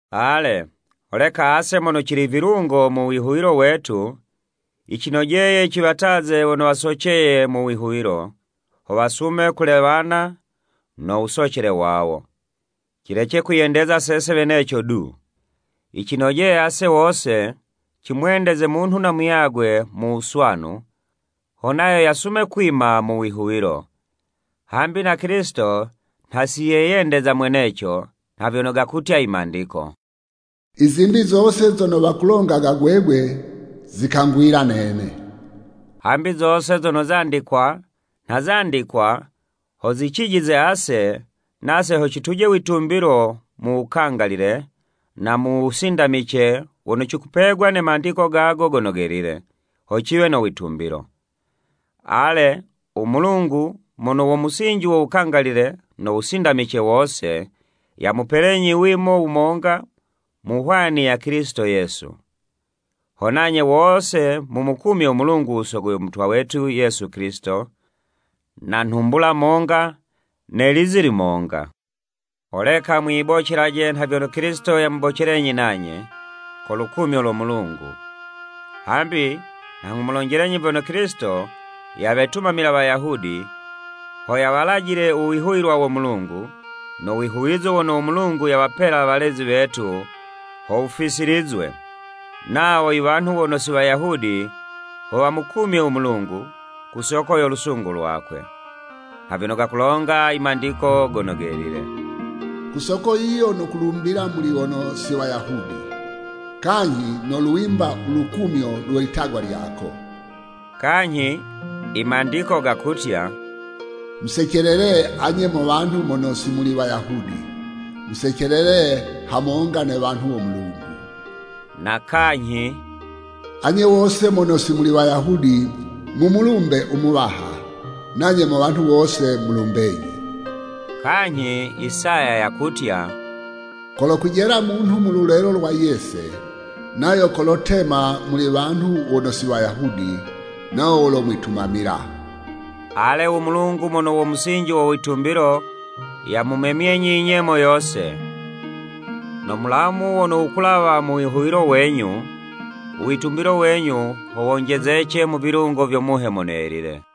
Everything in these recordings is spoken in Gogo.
Ale, holeka ase mono cili vilungo mu wihuwilo wetu, yicinojeye ciwataze wono wasoceye mu wihuwilo, ho wasume kulewana no wusocele wawo. Cilece kwiyendeza sese weneco du. Yicinojeye ase wose, cimwendeze munhu na muyagwe mu wuswanu, ho nayo yasume kwima mu wihuwilo. Hambi na Kilisito nha si yeyendeza mweneco, nha vyono gakutya i Mandiko, “I zimbi zose zono wakulongaga gwegwe, zikangwila nene.” Hambi zose zono zandikwa, nha zandikwa ho zicijize ase, nase ho cituje witumbilo mu wukangalile, na mu wusindamice wono cikupegwa ne Mandiko gago Gono Gelile, ho ciwe no witumbilo. Ale u Mulungu mono wo musinji wo wukangalile no wusindamice wose, yamupelenyi wimo wumonga mu hwani ya Kilisito Yesu. Ho nanye wose mumukumye u Mulungu u Sogo yo Mutwa wetu Yesu Kilisito na nhumbula monga ne lizi limonga. Holeka mwiyibocelaje nha vyono Kilisito yamubocelenyi nanye, ko lukumyo lo Mulungu. Hambi nha nghumulonjelenyi vyono Kilisito yawetumamila Wayahudi, ho yawalajile u Wihuwilwa wo Mulungu, no wihuwizo wono u Mulungu yawapela walezi wetu ho wufisilizwe, nawo iwanhu wono si Wayahudi, ho wamukumye u Mulungu, ku soko yo lusungu lwakwe. Nha vyono gakulonga i Mandiko Gono Gelile: “Ku soko yiyo nokulumbila muli wono si Wayahudi kanyhi nolwimba u lukumyo lwe litagwa lyako.” Kanyhi i Mandiko gakutya: “Musecelele anye mo wanhu mono si muli Wayahudi. Musecelele hamonga ne wanhu wo Mulungu.” Na kanyhi: “Anye wose mono si muli Wayahudi, mumulumbe u Muwaha, nanye mo wanhu wose mulumbenyi.” Kanyhi Isaya yakutya: “Kolokwijela munhu mu lulelo lwa Yese nayo kolotema muli wanhu wono si Wayahudi nawo wolomwitumamila.” Ale u Mulungu mono wo musinji wo witumbilo, yamumemyenyi inyemo yose, no mulamu wono wukulawa mu wihuwilo wenyu, u witumbilo wenyu ho wonjezece mu vilungo vyo Muhe Mono Yelile.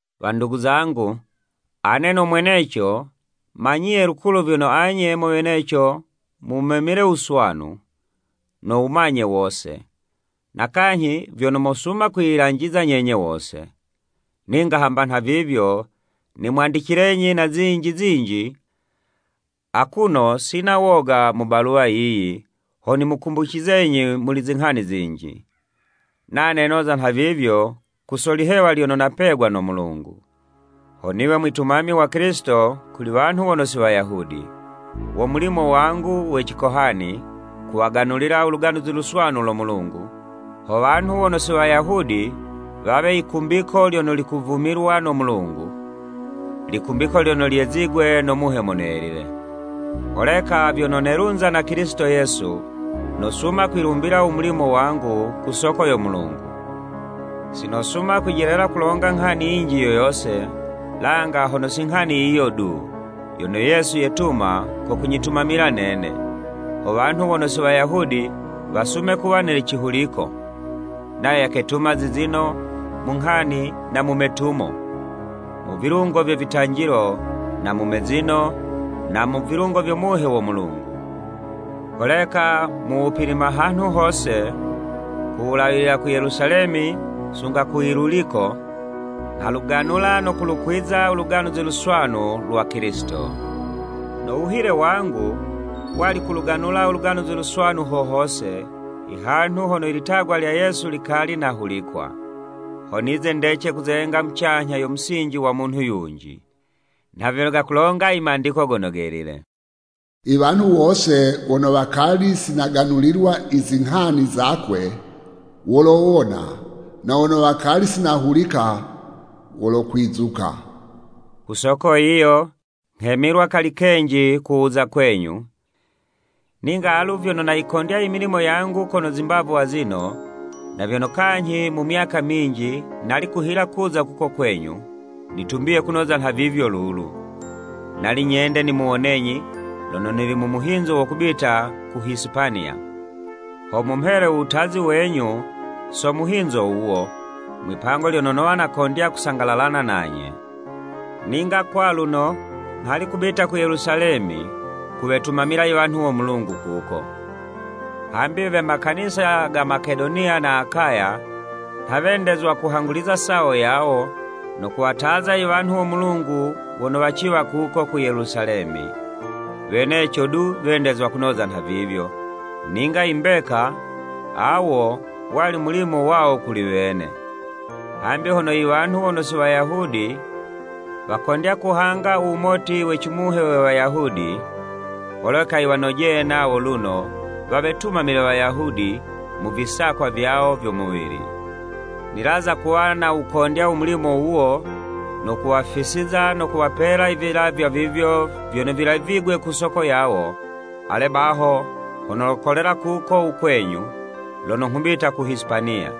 Wandugu zangu, ane no mweneco, manyiye lukulu vyono anye mo weneco mumemile u wuswanu, no wumanye wose, na kanyhi vyono mosuma kwiyilanjiza nyenye wose. Ninga hamba nhavivyo, nimwandicilenyi na zinji zinji akuno sina woga mu baluwa yiyi, ho nimukumbucizenyi muli zinghani zinji. Nane noza nhavivyo ku so lihewa lyono napegwa no Mulungu, ho niwe mwitumami wa Kilisito kuli wanhu wono si Wayahudi. Wo mulimo wangu we cikohani kuwaganulila u Luganuzi Luswanu lo Mulungu, ho wanhu we wono si Wayahudi wawe yikumbiko lyono likuvumilwa no Mulungu, likumbiko lyono lyezigwe no Muhe Mono Yelile. Holeka vyono nelunza na Kilisito Yesu, nosuma kwilumbila u mulimo wangu ku soko yo Mulungu. Si nosuma kwijelela kulonga nghani yinji yo yose, langa hono si inghani yiyo du, yono Yesu yetuma ko kunyitumamila nene, ho wanhu wono si Wayahudi wasume kuwa ne cihuliko. Nayo yaketuma zizino, mu nghani na mu metumo. Mu vilungo vye vitanjilo na mu mezino, na mu vilungo vyo Muhe wo Mulungu. Holeka mu wupilima hanhu hose, ku wulawilila ku Yelusalemi sunga ku Iluliko, nghaluganula no kulukwiza u Luganuzi Luswanu lwa Kilisito. No wuhile wangu, wali kuluganula u Luganuzi Luswanu ho hose, ihanhu hono ilitagwa lya Yesu likali nahulikwa, ho nize ndece kuzenga mucanyha yo musinji wa munhu yunji. Nha vyono gakulonga i Mandiko Gono Gelile. “I wanhu wose wono wakali si naganulilwa izinghani zakwe, wolowona, Na wono wakali si nahulika, Wolokwizuka.” Ku soko yiyo, nghemilwa kali kenji ku wuza kwenyu. Ninga alu vyono nayikondya imilimo yangu kono zimbavu azino, na vyono kanyhi mu myaka minji, nali kuhila kuza kuko kwenyu, nitumbiye kunoza nhavivyo lulu. Nali nyende nimuwonenyi, lono nili mu muhinzo wo kubita ku Hisipaniya, ho mumhele u wutazi wenyu so muhinzo wuwo, mwipango lyono nowa nakondya kusangalalana nanye. Ninga kwaluno, nghali kubita ku Yelusalemi kuwetumamila iwanhu wo Mulungu kuko. Hambi we makanisa ga Makedoniya na Akaya, nha wendezwa kuhanguliza sawo yawo, no kuwataza iwanhu wo Mulungu wono waciwa kuko ku Yelusalemi. Weneco du wendezwa kunoza nhavivyo; ninga imbeka, awo wali mulimo wawo kuli wene. Hambi hono iwanhu wono si Wayahudi wakondya kuhanga u wumoti we cimuhe we Wayahudi, holeka yiwanojeye nawo luno, wawetumamile Wayahudi mu visakwa vyawo vyo muwili. Nilaza kuwa nawukondya u mulimo wuwo, no kuwafisiza no kuwapela ivilavywa vivyo vyono vilavigwe ku soko yawo, ale baho ho nolokolela kuko u kwenyu, lono nghubita ku Hisipaniya.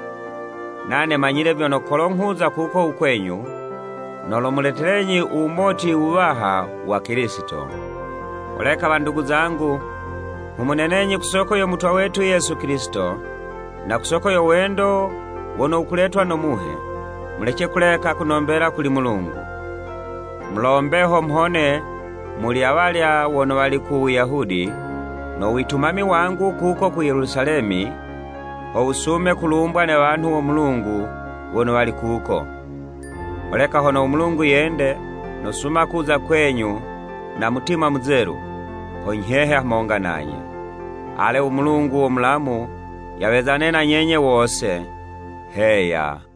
Nane manyile vyono kolo nghuza kuko u kwenyu, nolomuletelenyi u wumoti wuwaha wa Kilisito. Holeka wandugu zangu nghumunenenyi ku soko yo Mutwa wetu Yesu Kilisito, na ku soko yo wendo wono wukuletwa no Muhe, mulece kuleka kunombela kuli Mulungu. Mulombe ho mhone muli awalya wono wali ku Wuyahudi, no witumami wangu kuko ku Yelusalemi, ho wusume kulumbwa ne wanhu wo Mulungu wono wali kuko. Holeka hono u Mulungu yende, nosuma kuza kwenyu na mutima muzelu, ho nyhehe hamonga nanye. Ale u Mulungu wo mulamu yawezane na nyenye wose. Heya.